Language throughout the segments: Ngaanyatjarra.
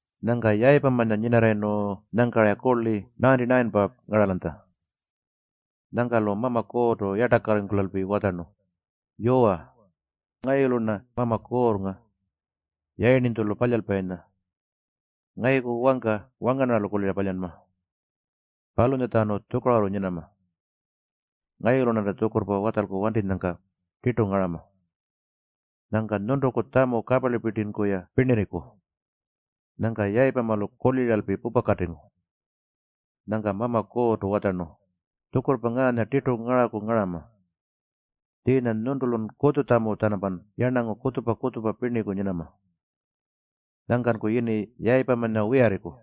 Nyangka Yayipamanya nyinarrayirnu nyangka-ra kurli 99-pa ngaralanytja. Nyangka-lu Mama Kuurrtu yartakarringkulalpi watjarnu, “Yuwa, ngayulu-rna Mama Kuurrnga, Yayirninytjulu Palyalpayinya. Ngayuku wangka wangarnarralu kulira palyanma. Palunyatjanu tjukarurru nyinama. Ngayulu-rnanta tjukurrpa watjalku wantinyangka tirtu ngarama. Nyangka nyuntuku tjamu kaparlipirtinku-ya pirnirriku.” Nyangka Yayipamalu kuliralpi pupakatingu. Nyangka Mama Kuurrtu watjarnu, “Tjukurrpa ngaanya tirtu ngaraku ngarama. Tjiinya nyuntulun kutjutjamu-tjanampan yarnangu kutjupa-kutjupa pirniku nyinama. Nyangkanku yini Yayipamanya wiyarriku.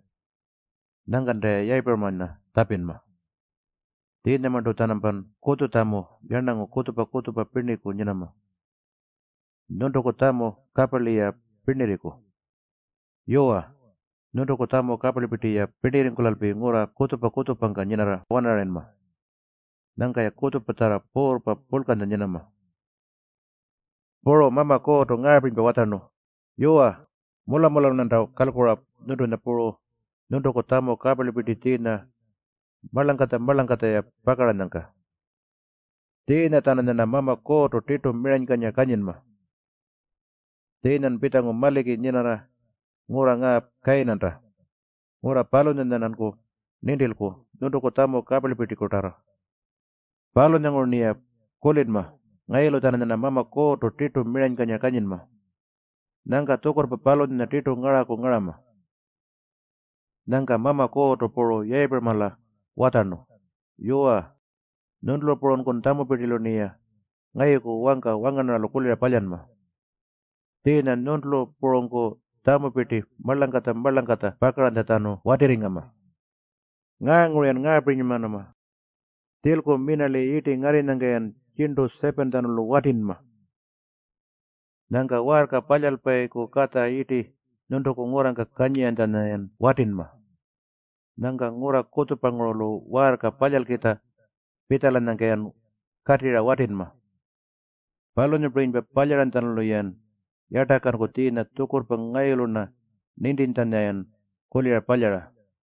Nyangkanta-ya Yayipuramanya tjapinma. Tjiinyamarntu-tjanampan kutjutjamu yarnangu kutjupa-kutjupa pirniku nyinama. Nyuntuku tjamu kaparli-ya pirnirriku. Yuwa, nyuntuku tjamu kaparlipirti-ya pirnirringkulalpi ngurra kutjupa-kutjupangka nyinarra-wanarayinma. Nyangka-ya kutjupatjarra puurrpa purlkanya nyinama.” Puru Mama Kuurrtu ngaapirinypa watjarnu, “Yuwa, mula-mulalu-rnanta kalkura nyuntunya puru nyuntuku tjamu kaparlipirti tjiinya marlangkatja-marlangkatja-ya pakaranyangka. Tjiinya-tjananyarna Mama Kuurrtu tirtu miranykanyira kanyinma. Tjiinyan pitjangu maliki nyinarra ngurra ngaa Kayinanta, ngurra palunyanya-rnanku nintilku nyuntuku tjamu kaparlipirtikutarrartu. Palunyanguru-rniya kulinma ngayulu-tjananyarna Mama Kuurrtu tirtu miranykanyira kanyinma. Nyangka tjukurrpa palunyanya tirtu ngaraku ngarama.” Nyangka Mama Kuurrtu puru Yayipuramala watjarnu, “Yuwa, nyuntulu purunku tjamupirtilu-rniya ngayuku wangka wangarnarralu kulira palyanma. Tjiinya nyuntulu purunku tjamupirti marlangkatja-marlangkatja pakaranytjatjanu watirringama. Ngaanguru-yan ngaapirinymanama. Tjilku minarli yirti ngarrinyangka-yan tjirntu 7-tjanulu watinma. Nyangka waarka palyalpayiku katja yirti nyuntuku ngurrangka kanyiranytjanya-yan watinma. Nyangka ngurra kutjupangurulu waarka palyalkitja pitjalanyangka-yan katirra watinma. Palunyapirinypa palyaranytjalu-yan yartakanku tjiinya tjukurrpa ngayulu-rna nintintjanya-yan kulira palyara.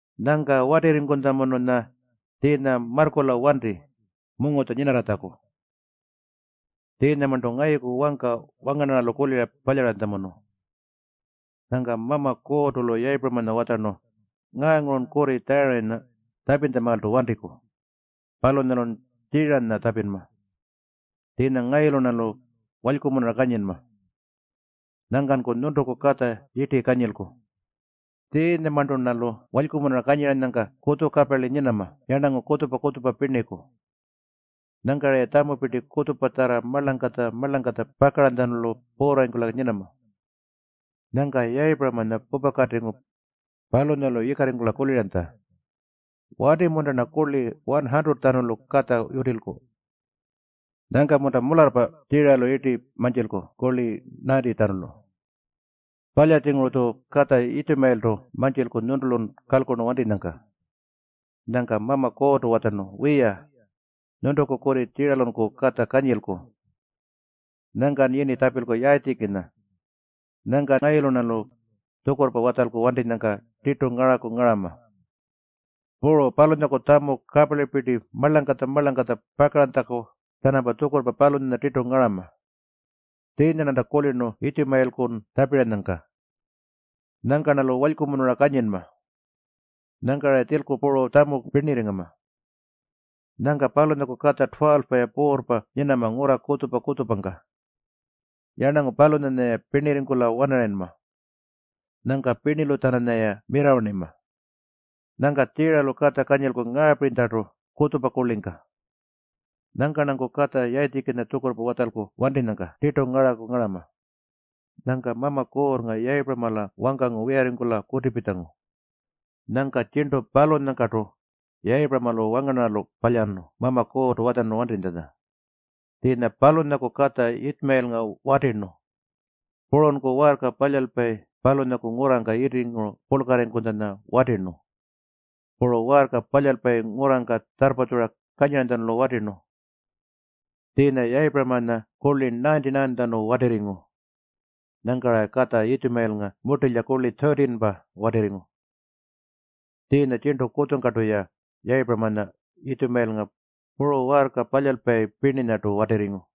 Nyangka watirringkutjamununya tjiinya marrkula wanti mungutja nyinarratjaku. Tjiinyamarntu ngayuku wangka wangarnarralu kulira palyaranytjamunu.” Nyangka Mama Kuurrtu-lu Yayipuramanya watjarnu, “Ngaangurun kurri Tjarayinya tjapintjamaaltu wantiku. Palunyalun Tjiiranya tjapinma. Tjiinya ngayulu-rnalu walykumunura kanyinma. Nyangkanku nyuntuku katja yirti kanyilku. Tjiinyamarntu-rnalu walykumunura kanyiranyangka kutjukaparli nyinama yarnangu kutjupa-kutjupa pirniku. Nyangka-raya tjamupirti kutjupatjarra marlangkatja-marlangkatja pakaranytjalu puurrarringkula nyinama.” Nyangka Yayipuramanya pupakatingu. Palunyalu yikarringkula kuliranytja, “Wati-munta-rna kurli 100-tjanulu katja yutilku? Nyangka-munta mularrpa Tjiiralu yirti mantjilku kurli 90-tjanulu? Palya-tjinguru-tju katja Yitjumayiltu mantjilku nyuntulun kalkurnu wantinyangka.” Nyangka Mama Kuurrtu watjarnu, “Wiya, nyuntuku kurri Tjiiralunku katja kanyilku. Nyangkan yini tjapilku Yayitjikinya. Nyangka ngayulu-rnalu tjukurrpa watjalku wantinyangka tirtu ngaraku ngarama. Puru palunyaku tjamu kaparlipirti marlangkatja-marlangkatja pakaranytjaku-tjanampa tjukurrpa palunyanya tirtu ngarama. Tjiinya-rnanta kulirnu Yitjumayilkun tjapiranyangka. Nyangka-rnalu walykumunura kanyinma. Nyangka-ra tjilku puru tjamu pirnirringama. Nyangka palunyaku katja 12-pa-ya puurrpa nyinama ngurra kutjupa-kutjupangka. Yarnangu palunyanya-ya pirnirringkula-wanarayinma. Nyangka pirnilu-tjananyaya mirrawarnima. Nyangka Tjiiralu katja kanyilku ngaapirinytjartu kutjupa kurlingka. Nyangka-rnanku katja Yayitjikinya tjukurrpa watjalku wantinyangka tirtu ngaraku ngarama.” Nyangka Mama Kuurrnga Yayipuramala wangkangu wiyarringkula kutipitjangu. Nyangka tjirntu palunyangkartu Yayipuramalu wangarnarralu palyarnu Mama Kuurrtu watjarnu wantitjanya. Tjiinya palunyaku katja Yitjumayilnga watirnu. Purunku waarka palyalpayi palunyaku ngurrangka yirtinguru purlkarringkutjanya watirnu. Puru waarka palyalpayi ngurrangka tjarrpatjura kanyiranytjalu watirnu. Tjiinya Yayipuramanya kurli 99-tjanu watirringu. Nyangka-ra katja Yitjumayilnga murtilya kurli 13-pa watirringu. Tjiinya tjirntu kutjungkartu-ya Yayipuramanya, Yitjumayilnga, puru waarka palyalpayi pirninyartu watirringu.